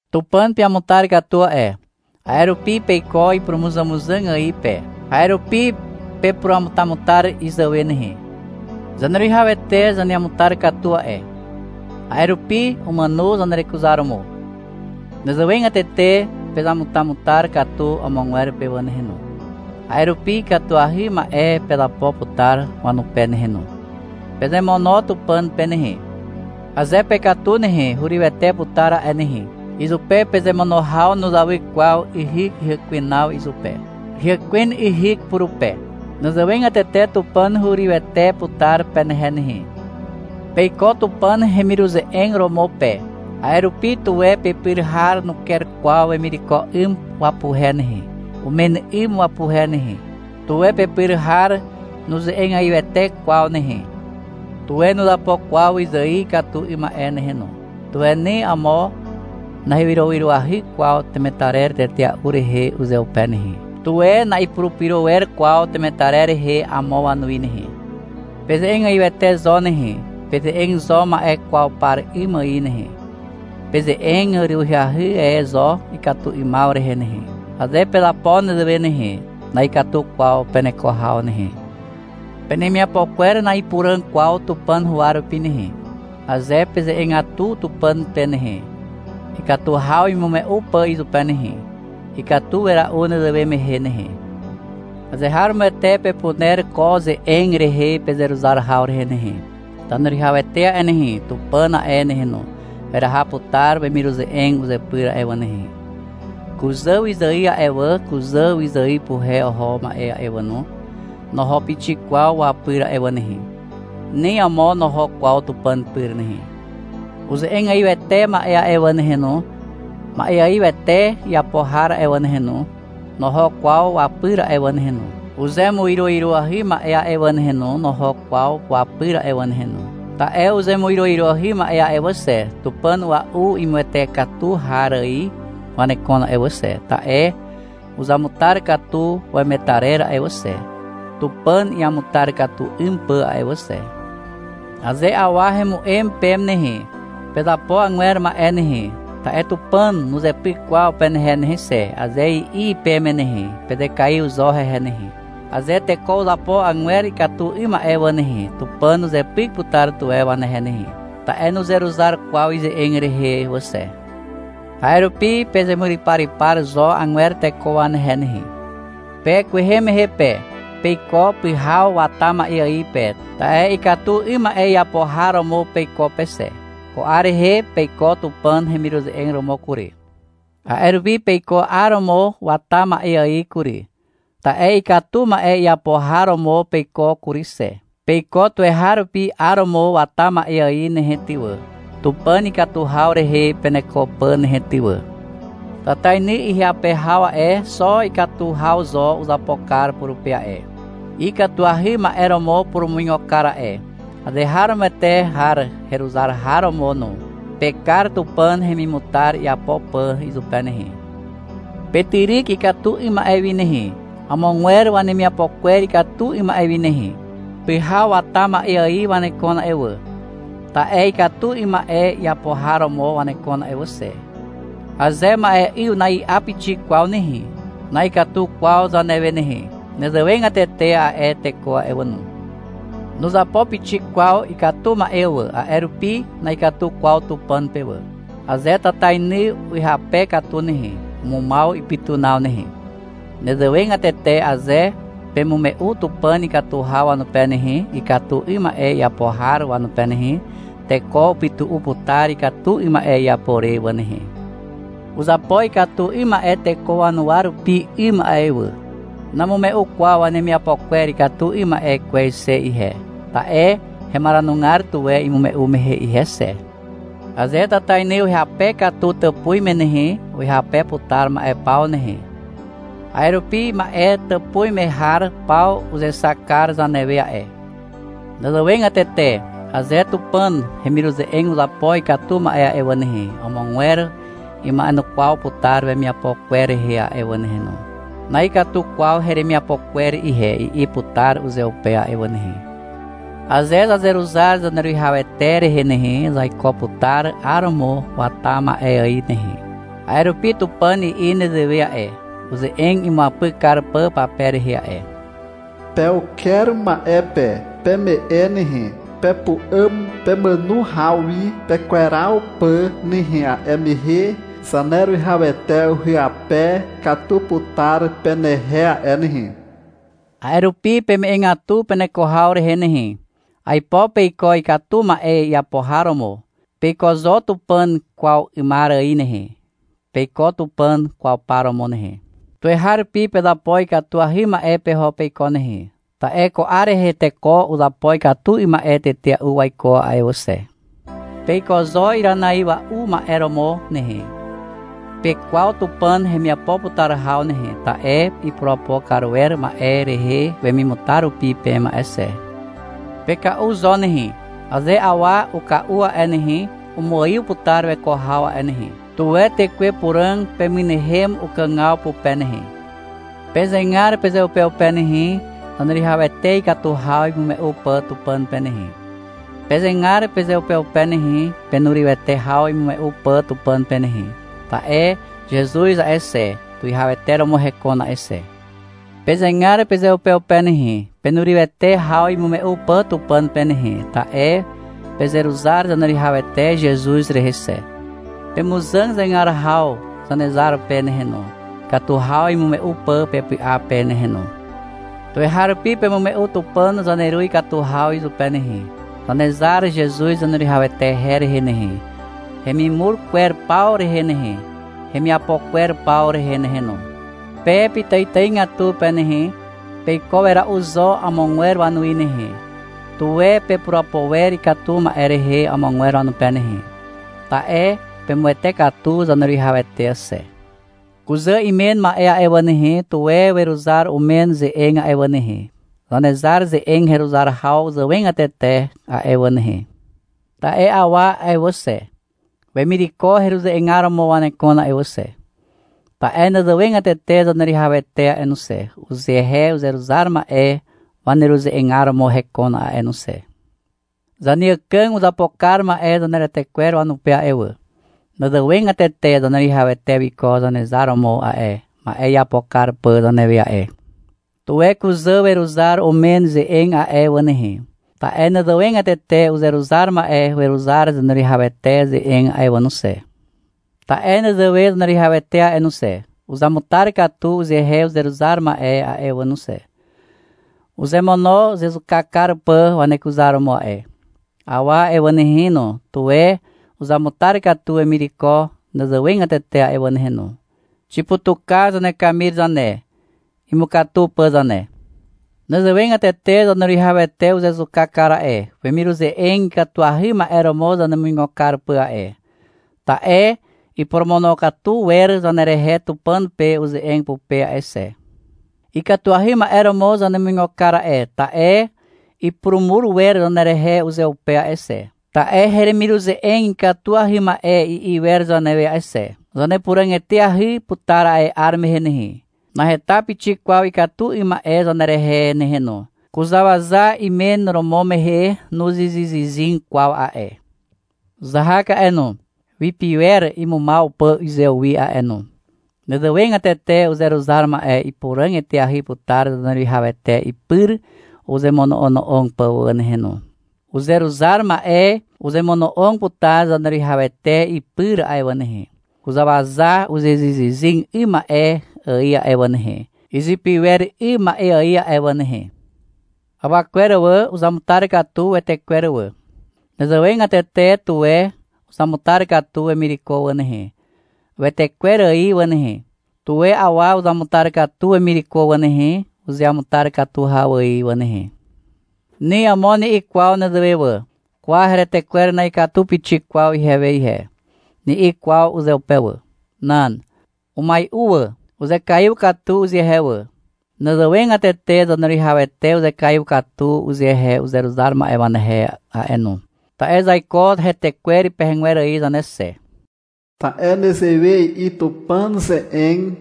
Tupàn peamutar katu a'e. A'e rupi peiko ipurumuzàmuzàg ài pe. A'e rupi pepuramutamutar izàwe nehe. Zaneruwihawete zaneamutar katu a'e. A'e rupi umàno zanerekuzaromo. Nezewegatete pezamutamutar katu amogwer pe wà nehe no. A'e rupi ikatuahy ma'e pezapo putar wanupe nehe no. Pezemono Tupàn pe nehe. Aze pekatu nehe, hurywete putar a'e nehe. Izupe pezemono haw nuzawy kwaw yhyk hyàkwenaw izupe. Hyàkwen yhyk purupe. Nezewegatete Tupàn hurywete putar penehe nehe. Peiko Tupàn hemiruze'eg romo pe. A'e rupi, tuwe pepyr har nuker kwaw wemireko 'ym wapuhe nehe, umen 'ym wapuhe nehe. Tuwe pepyr har nuze'egaiwete kwaw nehe. Tuwe nuzapo kwaw wyzài ikatu 'ym ma'e nehe no. Tuwe ni amo nahewyrowyroahy kwaw temetarer tetea'u rehe uzeupe nehe. Tuwe na'ipurupyro wer kwaw temetarer rehe amo wanuwi nehe. Peze'egaiwete zo nehe. Peze'eg zo ma'e kwaw par 'ym ài nehe. Peze'eg urywahy e zo ikatu 'ymaw rehe nehe. Aze pezapo nezewe nehe, na'ikatu kwaw peneko haw nehe. Penemiapo kwer na'ipuràg kwaw Tupàn huwa rupi nehe. Aze peze'egatu Tupàn pe nehe, ikatu haw imume'u pà izupe nehe, ikatu wera'u nezewe mehe nehe. Azeharomoete pepuner ko ze'eg rehe pezeruzar haw rehe nehe. Zaneruwihawete a'e nehe, Tupàn a'e nehe no, weraha putar wemiruze'eg uzepyr a'e wà nehe. Kuzà wyzài a'e wà, kuzà wyzài puhe oho ma'e a'e wà no, noho pixik kwaw wapyr a'e wà nehe. Ni amo noho kwaw Tupàn pyr nehe. Uze'egaiwete ma'e a'e wà nehe no, ma'eaiwete iapo har a'e wà nehe no, noho kwaw wapyr a'e wà nehe no. Uzemuiroiroahy ma'e a'e wà nehe no, noho kwaw wapyr a'e wà nehe no. Ta'e uzemuiroiroahy ma'e a'e wà xe, tupàn a'ua'u imuwete katu har ài wanekon a'e wà xe, ta'e uzamutar katu wemetarer a'e wà xe, Tupàn iamutar katu 'ym pà a'e wà xe. Aze awa hemu'em peme nehe, — Pezapo agwer ma'e nehe, ta'e Tupàn nuzepyk kwaw penehe nehe xe, aze i'i peme nehe, pezekaiw zo hehe nehe. Aze teko uzapo agwer ikatu 'ym ma'e wà nehe, Tupàn uzepyk putar tuwe wanehe nehe. Ta'e nuzeruzar kwaw ize'eg rehe wà xe. A'e rupi pezemuryparypar zo agwer teko wanehe nehe. Pe kwehe mehe pe, peiko pyhaw wata ma'e ài pe, ta'e ikatu 'ym ma'e iapo har romo peiko pe xe. Ko 'ar rehe peiko Tupàn hemiruze'eg romo kury. A'e rupi peiko 'aromo wata ma'e ài kury. Ta'e ikatu ma'e iapo har romo peiko kury xe. Peiko tuweharupi 'aromo wata ma'e ài nehe ty wà, Tupàn ikatu haw rehe peneko pà nehe ty wà. Tatainy ihyape haw a'e, xo ikatu haw zo uzapo kar purupe a'e. Ikatuahy ma'e romo upurumuigo kar a'e, azeharomoete har heruzar har romo no. Pekar Tupàn hemimutar iapo pà izupe nehe. Petyryk ikatu 'ym ma'e wi nehe, amogwer wanemiapo kwer ikatu 'ym ma'e wi nehe. Pyhaw wata ma'e ài wanekon a'e wà. Ta'e ikatu 'ym ma'e iapo har romo wanekon a'e wà xe. Aze ma'e'yw na'i'a pixik kwaw nehe, na'ikatu kwaw zanewe nehe. Nezewegatete a'e teko a'e wà no. Nuzapo pixik kwaw ikatu ma'e wà, a'e rupi na'ikatu kwaw Tupàn pe wà. Aze tatainy uhyape katu nehe, umumaw ipytunaw nehe. Nezewegatete aze pemume'u Tupàn ikatu haw wanupe nehe, ikatu 'ym ma'e iapo har wanupe nehe, teko upytu'u putar ikatu 'ym ma'e iapo re wà nehe. Uzapo ikatu 'ym ma'e teko wanuwa rupi 'ym a'e wà. Namume'u kwaw wanemiapo kwer ikatu 'ym ma'e kwez xe ihe, ta'e hemaranugar tuwe imume'u mehe ihe xe. Aze tatainy uhyape katu tàpuz me nehe, uhyape putar ma'e paw nehe. A'e rupi ma'e tàpuz me har paw uzexak kar zanewe a'e. Nezewegatete aze Tupàn hemiruze'eg uzapo ikatu ma'e a'e wà nehe, amogwer ima'enukwaw putar wemiapo kwer rehe a'e wà nehe no. — Na'ikatu kwaw heremiapo kwer ihe, i'i putar uzeupe a'e wà nehe. Aze zazeruzar Zaneruwihawete rehe nehe, zaiko putar 'aromo wata ma'e ài nehe. A'e rupi Tupàn i'i nezewe a'e, uze'eg imuapyk kar pà pape rehe a'e. Pe uker ma'e pe. Peme'e nehe. Pepu'àm pemàno haw wi pekweraw pà nehe A'e mehe Zaneruwihawete uhyape katu putar penehe a'e nehe. A'e rupi peme'egatu peneko haw rehe nehe. Aipo peiko ikatu ma'e iapo har romo. Peiko zo Tupàn kwaw 'ymar ài nehe. Peiko Tupàn kwaw par romo nehe. Tuweharupi pezapo ikatuahy ma'e peho peiko nehe. Ta'e ko 'ar rehe teko uzapo ikatu 'ym ma'e tetea'u waiko a'e wà xe. Peiko zo iranaiwa'u ma'e romo nehe. Pekwaw Tupàn hemiapo putar haw nehe, ta'e ipurapo kar wer ma'e rehe wemimutar rupi peme a'e xe. Peka'u zo nehe. Aze awa uka'u a'e nehe, umuaiw putar weko haw a'e nehe. Tuwe Tekwe Puràg pemynehem ukàgaw pupe nehe. Pezegar pezeupeupe nehe, Zaneruwihawete ikatu haw imume'u pà Tupàn pe nehe. Pezegar pezeupeupe nehe, penurywete haw imume'u pà Tupàn pe nehe. Ta'e Zezuz a'e xe, tuwihawete romo hekon a'e xe. Pezegar pezeupeupe nehe, penurywete haw imume'u pà Tupàn pe nehe, ta'e pezeruzar Zaneruwihawete Zezuz rehe xe. Pemuzàg zegar haw Zanezar pe nehe no, ikatu haw imume'u pà pepy'a pe nehe no. Tuweharupi pemume'u Tupàn zaneru ikatu haw izupe nehe, Zanezar Zezuz Zaneruwihawete her rehe nehe, hemimur kwer paw rehe nehe, hemiapo kwer paw rehe nehe no. Pe pitàitàigatu pe nehe, peiko wera'u zo amogwer wanuwi nehe. Tuwe pepurapo wer ikatu ma'e rehe amogwer wanupe nehe. Ta'e pemuwete katu Zaneruwihawete xe. Kuzà imen ma'e a'e wà nehe, tuwe weruzar umen ze'eg a'e wà nehe, Zanezar ze'eg heruzar haw zàwegatete a'e wà nehe. Ta'e awa a'e wà xe, wemireko heruze'egar romo wanekon a'e wà xe. Ta'e nezewegatete Zaneruwihawete a'e no xe, uzehe uzeruzar ma'e waneruze'egar romo hekon a'e no xe. Zaneàkàg uzapo kar ma'e zaneretekwer wanupe a'e wà. Nezewegatete Zaneruwihawete wiko Zanezar romo a'e, ma'e iapo kar pà zanewe a'e. Tuwe kuzà weruzar umen ze'eg a'e wà nehe. Ta'e nezewegatete uzeruzar ma'e weruzar Zaneruwihawete ze'eg a'e wà no xe. Ta'e nezewe Zaneruwihawete a'e no xe, uzamutar katu uzehe uzeruzar ma'e a'e wà no xe. Uzemono uzezuka kar pà wanekuzaromo a'e. Awa a'e wà nehe no, tuwe uzamutar katu wemireko nezewegatete a'e wà nehe no. Xiputuka zanekamir zane, imukatu pà zane. Nezewegatete Zaneruwihawete uzezuka kar a'e, wemiruze'eg ikatuahy ma'e romo zanemuigo kar pà a'e. Ta'e iporomonokatu wer zanerehe Tupàn pe uze'eg pupe a'e xe. Ikatuahy ma'e romo zanemuigo kar a'e, ta'e ipurumur wer zanerehe uzeupe a'e xe. Ta'e — Heremiruze'eg ikatuahy ma'e, i'i wer zanewe a'e xe. Zanepuràg eteahy putar a'e 'ar mehe nehe. Naheta pixik kwaw ikatu 'ym ma'e zanerehe nehe no. Kuzàwaza imen romo mehe nuzyzyzyzyg kwaw a'e. Uzahak a'e no, wipiwer imumaw pà uzewi a'e no. Nezewegatete uzeruzar ma'e ipuràg eteahy putar Zaneruwihawete ipyr uzemono'ono'og pà wà nehe no. Uzeruzar ma'e uzemono'og putar Zaneruwihawete ipyr a'e wà nehe, kuzàwaza uzyzyzyzyg 'ym ma'e ài a'e wà nehe, izipiwer 'ym ma'e ài a'e wà nehe. Awa kwer wà, uzamutar katu wetekwer wà. Nezewegatete, tuwe uzamutar katu wemireko wà nehe, wetekwer ài wà nehe. Tuwe awa uzamutar katu wemireko wà nehe, uzeamutar katu haw ài wà nehe. Ni amo ni'i kwaw nezewe wà. — Kwa, heretekwer na'ikatu pixik kwaw ihewe ihe, ni'i kwaw uzeupe wà. Nan. Umai'u wà. Uzekaiw katu uzehe wà. Nezewegatete Zaneruwihawete uzekaiw katu uzehe uzeruzar ma'e wanehe a'e no. Ta'e zaiko hetekwer pegegwer ài zane xe. Ta'e nezewe i'i Tupàn ze'eg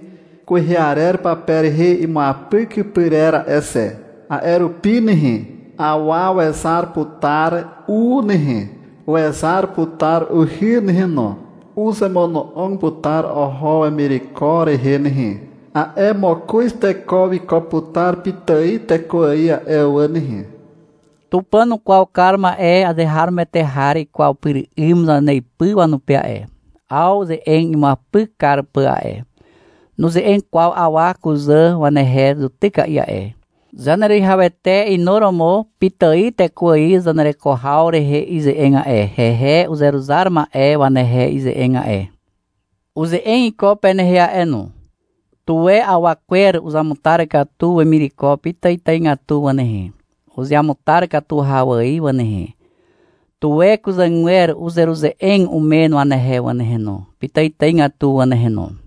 kwehe arer pape rehe imuapyk pyrer a'e xe. — A'e rupi nehe, awa wezar putar u nehe, wezar putar uhy nehe no. Uzemono'og putar oho wemireko rehe nehe. A'e mokoz teko wiko putar pitài teko ài a'e wà nehe. Tupàn ukwaw kar ma'e azeharomoete har ikwaw pyr 'ym zaneipy wanupe a'e, 'aw ze'eg imuapyk kar pà a'e. Nuze'eg kwaw awa kuzà wanehe zutyka'i a'e. Zaneruwihawete inuromo pitài teko ài zanereko haw rehe ize'eg a'e, hehe uzeruzar ma'e wanehe ize'eg a'e. Uze'eg iko penehe a'e no. Tuwe awa kwer uzamutar katu wemireko pitàitàigatu wà nehe, uzeamutar katu haw ài wà nehe. Tuwe kuzàgwer uzeruze'eg umen wanehe wà nehe no, pitàitàigatu wà nehe no.